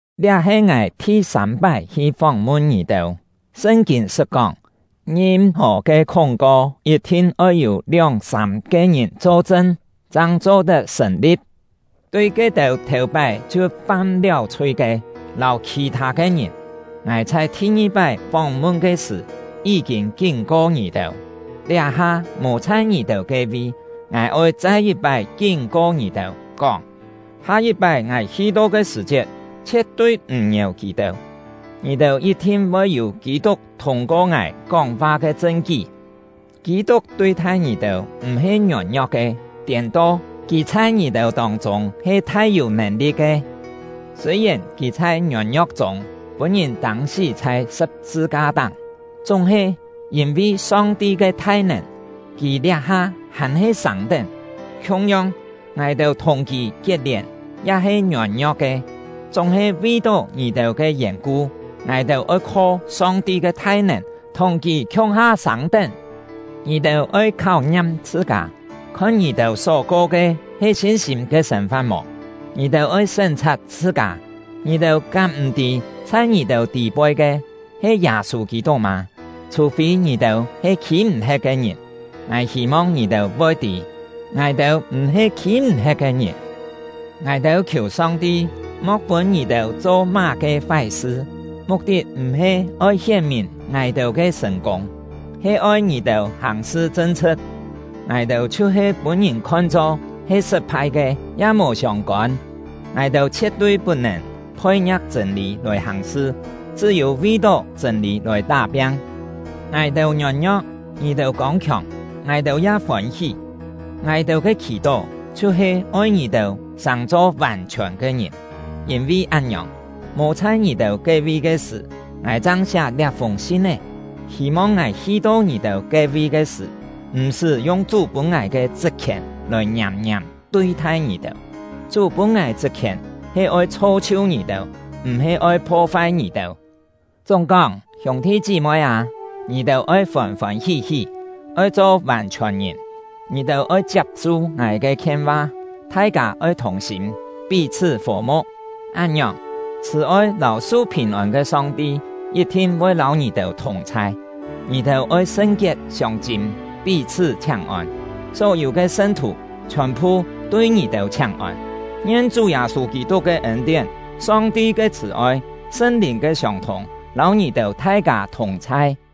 Liá he ngài thi-sâm-pái hi fóng-mun ngì-têu. Sṳn-kîn sṳt kóng: “Ngim-hò ke khúng-ko yit-thin oi yû lióng-sâm-ke ngìn cho-chṳn, chang cho-tet sṳ̀n-li̍p.” Tui ke-têu thèu-pái chhiu fam-liáu chhui ke, lâu khì-thâ ke ngìn, ngài chhai thi-ngi-pái fóng-mun ke sṳ̀ yí-kîn kín-ko ngì-têu, liá-ha mò chhai ngì-têu ke-vi, ngài oi chai yit-pái kín-ko ngì-têu, kóng: “Ha-yit-pái ngài hi-to ke sṳ̀-chiet, chhie̍t-tui m̀ ngièu kì-têu.” Ngì-têu yit-thin voi yû Kî-tuk thûng-ko ngài kóng-fa ke chṳn-kí. Kî-tuk tui-thai ngì-têu m̀-he ngiôn-ngio̍k ke; tiên-to, kì chhai ngì-têu tông-chûng he thai-yû nèn-li̍t ke. Sûi-yèn kì chhai ngiôn-ngio̍k chûng pûn-ngìn tâng-sí chhai sṳ̍p-sṳ-ka-táng, chúng-he, yîn-vi Song-ti ke thai-nèn, kì liá-ha hàn-he sâng-tén. Khiung-yong, ngài-têu thùng kì kiet-lièn ya he ngiôn-ngio̍k ke, chúng-he vi-tó ngì-têu ke yèn-ku, ngài-têu oi kho Song-ti ke thai-nèn thùng kì khiung-ha sâng-tén. Ngì-têu oi kháu-ngiam chhṳ-kâ, khon ngì-têu só ko ke he sin-sîm ke sên-fa̍t mò; ngì-têu oi sén-chhat chhṳ-kâ! Ngì-têu kám m̀-tî chhai ngì-têu tî-poi ke he Yâ-sû Kî-tuk mâ? Chhù-fî ngì-têu he khî-m̀-he̍t ke ngìn. Ngài hî-mong ngì-têu voi tî, ngài-têu m̀-he khî-m̀-he̍t ke ngìn. Ngài-têu khiù Song-ti mo̍k pûn ngì-têu cho má-ke fái-sṳ. Muk-tit m̀-he oi hién-mìn ngài-têu ke sṳ̀n-kûng, he oi ngì-têu hàng-sṳ chṳn-chhṳ̍t; ngài-têu chhiu-he pûn-ngìn khon-cho he sṳt-phai ke ya mò siông-kôn. Ngài-têu chhie̍t-tui put-nèn phoi-ngia̍k chṳ̂n-lî lòi hàng-sṳ, chṳ́-yû vi-tó chṳ̂n-lî lòi tá-piang. Ngài-têu ngiôn-ngio̍k, ngì-têu kông-khiòng, ngài-têu ya fôn-hí. Ngài-têu ke khì-tó chhiu-he oi ngì-têu sàng-cho vàn-chhiòn ke ngìn. Yîn-vi án-ngiòng, mò chhai ngì-têu ke-vi ke sṳ̀, ngài chang siá liá-fûng sin-é, hî-mong ngài hi-to ngì-têu ke-vi ke sṳ̀, m̀-sṳ́ yung Chú pûn ngài ke chṳt-khièn lòi ngiàm-ngiàm tui-thai ngì-têu. Chú pûn ngài chṳt-khièn he oi chho-chhiu ngì-têu, m̀-he oi pho-fai ngì-têu. Chúng-kóng, hiûng-thi chí-moi â, ngì-têu oi fôn-fôn hí-hí. Oi cho vàn-chhiòn-ngìn. Ngì-têu oi chiap-su ngài ke khien-va; thai-kâ oi thùng-sîm, pí-chhṳ́ fò-mu̍k. Án-ngiòng, chhṳ̀-oi lâu su phìn-ôn ke Song-ti yit-thin voi lâu ngì-têu thùng-chhai! Ngì-têu oi sṳn-kiet siông-chîm pí-chhṳ́ chhiáng-ôn! Só-yû ke sṳn-thù chhiòn-phu tui ngì-têu chhiáng-ôn! Ngien Chú Yâ-sû Kî-tuk ke ên-tién, Song-ti ke chhṳ̀-oi, Sṳn-Lìn ke siông-thûng, lâu ngì-têu thai-kâ thùng-chhai!